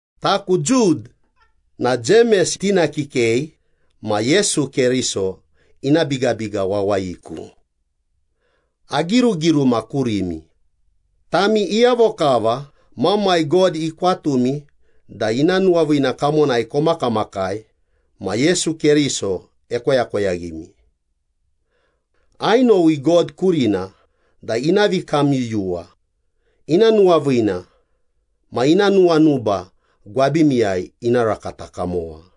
Taku Jud na Jemes tina kikei ma Yesu Keriso ina bigabiga wawayiku. Agirugiruma kurimi, tami iyavo kava Mamai God ikwatumi da ina nuwaviina kamonai komakamakai ma Yesu Keriso ekoyakoyaghimi. Ainowi God kurina da ina vikamyuyuwa, ina nuwaviina ma ina nuwanuba gwabimiyai ina rakata kamowa.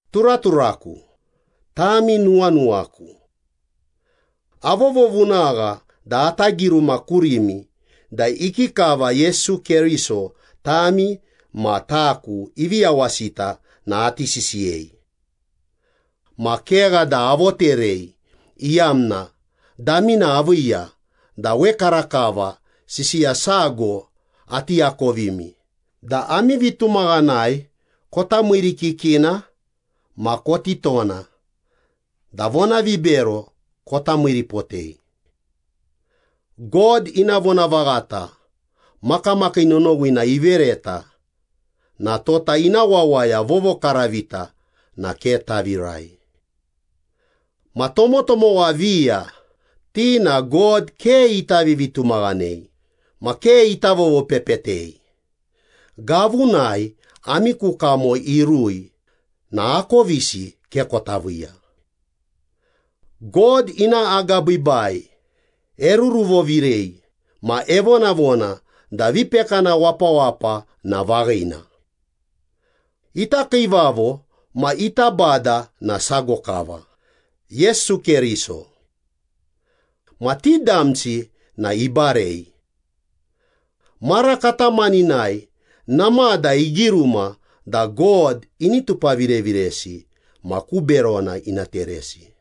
Turaturaku, tami nuwanuwaku. Avovovunagha da ata giruma kurimi da ikikava Yesu Keriso tami ma taku ivi yawasita na ati sisiyei. Ma kegha da avoterei iyamna damina aviiya da wekarakava sisiya sago ati akovimi da ami vitumaghanai kota miirikikina ma koti tona da vonavibero kota miiripotei. God ina vonavaghata makamakii nonowina ivereta na tota ina wawaya vovokaravita na ke tavirai. Ma tomotomowa viya ti na God ke ita vivitumaghanei ma ke ita vovopepetei, gavunai ami ku kamo irui na akovisi ke kota viiya. God ina agabiibai eruruvovirei ma evonavona da vipekana wapawapa na vaghina. Ita Kiivavo ma ita Bada na sago kava, Yesu Keriso. Ma ti damsi na ibarei. Mara katamaninai namada igiruma da God ini tupavireviresi ma ku berona ina teresi.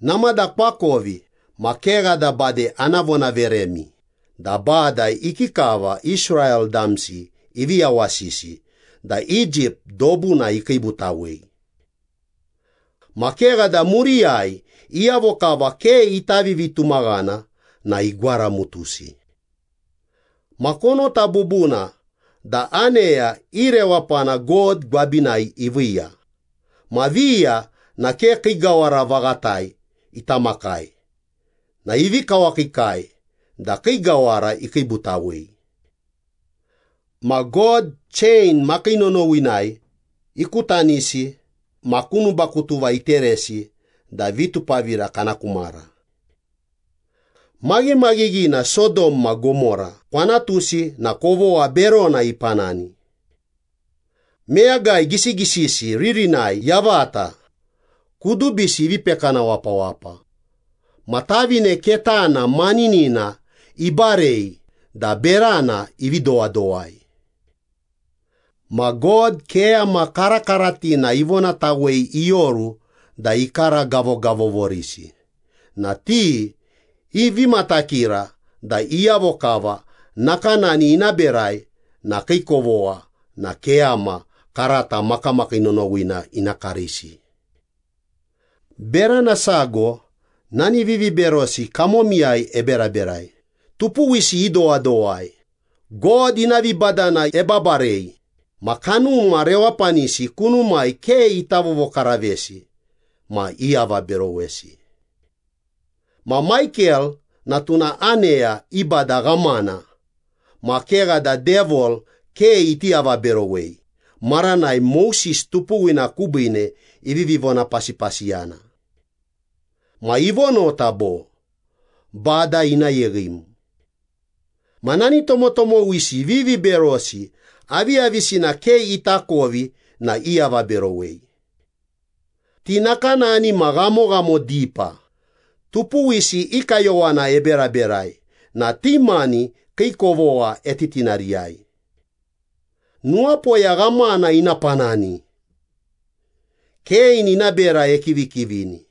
Namada koakovi ma kegha da bade ana vonaveremi da Bada ikikava Israel damsi ivi yawasisi da Egypt dobuna ikiibutawei. Ma kegha da muriyai iyavo kava ke ita vivitumaghana na igwaramutusi. Ma konota bubuna da aneya i rewapana God gwabinai iviiya ma viya na ke kii gawara vaghatai ita makai na ivi kawakiikai da kii gawara ikiibutawei. Ma God chein makii nonowinai ikutanisi ma ku nubakutuva iteresi da vitupavira kana ku mara. Maghimaghighina Sodom ma Gomora kwanatusi na kovogha berona ipanani. Meyagai gisigisisi ririnai yavata, kudubisi ivi pekana wapawapa, ma tavine ketana maninina ibarei da berana ivi dowadowai. Ma God keyama karakaratina ivonatawei ioru da ikaragavogavovorisi na ti ivi matakira da iyavo kava nakanani ina berai na kii kovogha na keyama karata makamakii nonowina ina karisi. Berana sago nani viviberosi kamomiyai eberaberai, tupuwisi idowadowai, God ina vibadana ebabarei, ma kanuma rewapanisi kunumai ke ita vovokaravesi ma iavaberowesi. Ma Maikel na tuna aneya i bada ghamana ma kegha da Devil ke iti avaberowei maranai Moses tupuwina kubiine ivivi vonapasipasiyana. Ma ivonota bo, “Bada ina yeghim.” Ma nani tomotomowisi viviberosi aviyavisina ke itakovi na iavaberowei. Ti nakanani ma ghamoghamo dipa, tupuwisi i kayowana eberaberai na ti mani kii kovogha etitinariyai. Nuwapoya ghamana ina panani! Kein ina bera ekivikivini.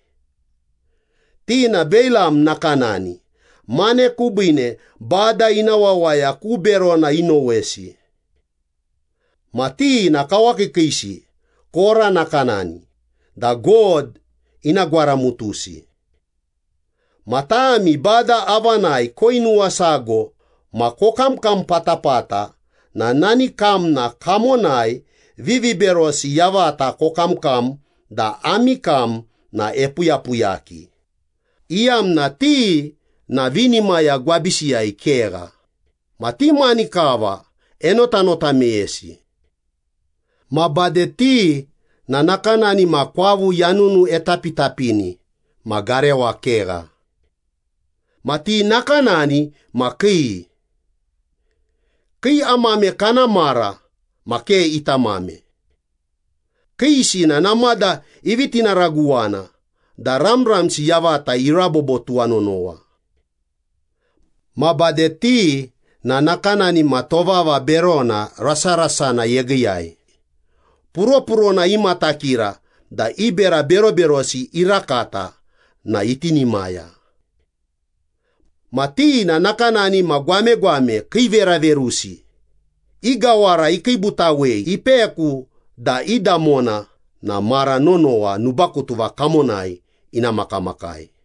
Ti na Beilam nakanani, mane kubiine Bada ina wawaya ku berona inowesi. Ma ti na kawakiikiisi Kora nakanani da God ina gwaramutusi. Ma tami Bada avanai koinuwasago ma kokamkam patapata na nani kamna kamonai viviberosi yavata kokamkam da ami kam na epuyapuyaki, iyamna ti na vinimaya gwabisiyai kegha, ma ti mani kava enotanota meyesi. Ma bade ti na nakanani ma kwavu yanunu etapitapini ma garewa kegha. Ma ti nakanani ma kii. Kii amame kana mara ma ke itamame. Kiisi na namada ivi tinaraguwana da ramramsi yavata irabobo tuwanonowa. Ma bade ti na nakanani ma tovava berona rasarasana yegiiyai, puropurona imatakira da i bera beroberosi irakata na itinimaya. Ma ti na nakanani ma gwamegwame kiiveraverusi, i gawara ikiibutawei ipeku da i damona na mara nonowa nubakutuva kamonai ina makamakai.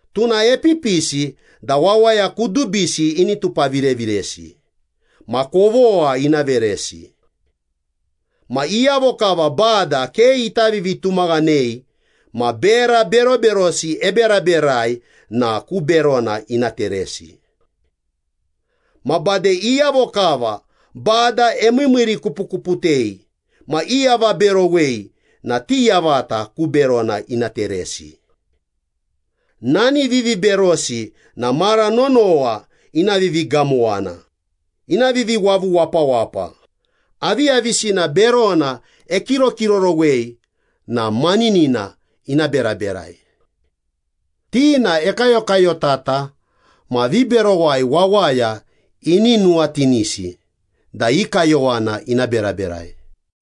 Tuna epipisi da wawaya kudubisi ini tupavireviresi, ma kovogha ina veresi. Ma iyavo kava Bada ke ita vivitumaghanei ma bera beroberosi eberaberai na ku berona ina teresi. Ma bade iyavo kava Bada emiimiirikupukuputei ma iavaberowei na ti yavata ku berona ina teresi.” Nani viviberosi na mara nonowa ina vivigamowana, ina viviwavu wapawapa, aviyavisina berona ekirokirorowei na maninina ina beraberai. Ti na ekayokayotata ma viberowai wawaya ini nuwatinisi da i kayowana ina beraberai.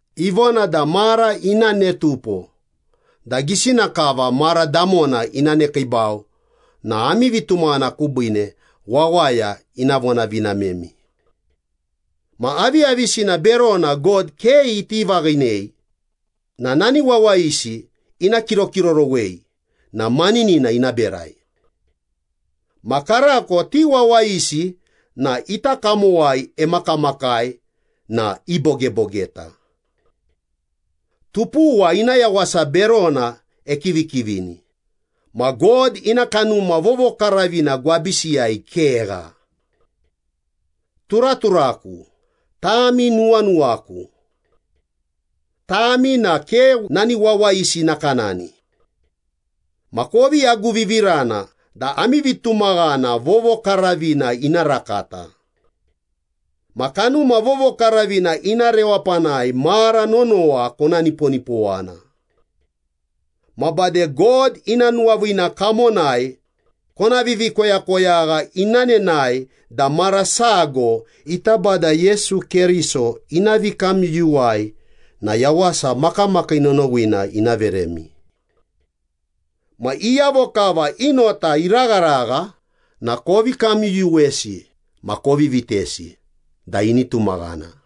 Ivona da mara ina ne tupo da gisina kava mara damona ina nekiibau na ami vitumaghana kubiine wawaya ina vonavinamemi. Ma aviyavisina berona God ke iti vaghinei na nani wawayisi ina kirokirorowei na maninina ina berai. Ma karako ti wawayisi na ita kamowai emakamakai na ibogebogeta. Tupuwa ina yawasa berona ekivikivini, ma God ina Kanuma Vovokaravina gwabisiyai kegha. Turaturaku, tami nuwanuwaku. Tami na ke nani wawayisi nakanani. Ma kovi aguvivirana da ami vitumaghana vovokaravina ina rakata. Ma Kanuma Vovokaravina ina rewapanai mara nonowa kona niponipowana. Ma bade God ina nuwaviina kamonai kona vivikoyakoyagha ina nenae da mara sago ita Bada Yesu Keriso ina vikamyuyuwai na yawasa makamakii nonowina ina veremi. Ma iyavo kava i nota iragharagha na kovi kamyuyuwesi ma kovi vitesi da ini tumaghana.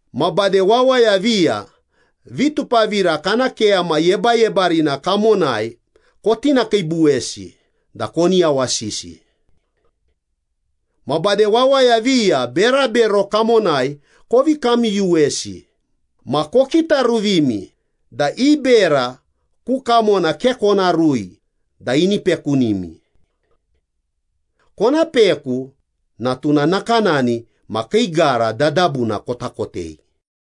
Ma bade wawaya viya vitupavira kana keyama yebayebarina kamonai kotinakiibuwesi da koni yawasisi. Ma bade wawaya viya berabero kamonai kovi kamyuyuwesi ma kokitaruvimi da i bera ku kamona ke kona rui da ini pekunimi. Kona peku na tuna nakanani ma kii gara dadabuna kota kotei.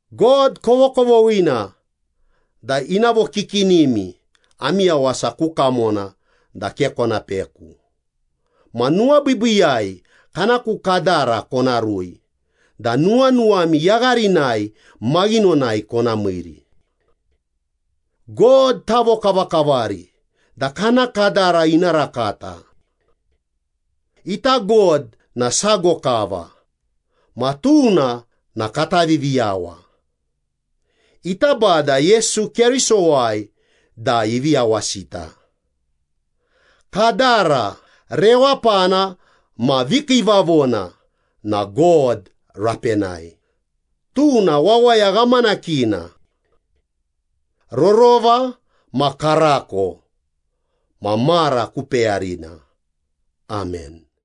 God kovokovoghina da ina vokikinimi ami yawasa ku kamona da ke kona peku, ma nuwabiibiiyai kana ku kadara kona rui da nuwanuwami yagharinai maghinonai kona miiri. God tavokavakavari da kana kadara ina rakata. Ita God na sago kava, ma tuna na kata Viviyawa. Ita Bada Yesu Kerisowai da ivi yawasita. Kadara, rewapana ma vikiivavona na God rapenai, tuna wawaya ghamanakina. Rorova ma karako ma mara ku peyarina. Amen.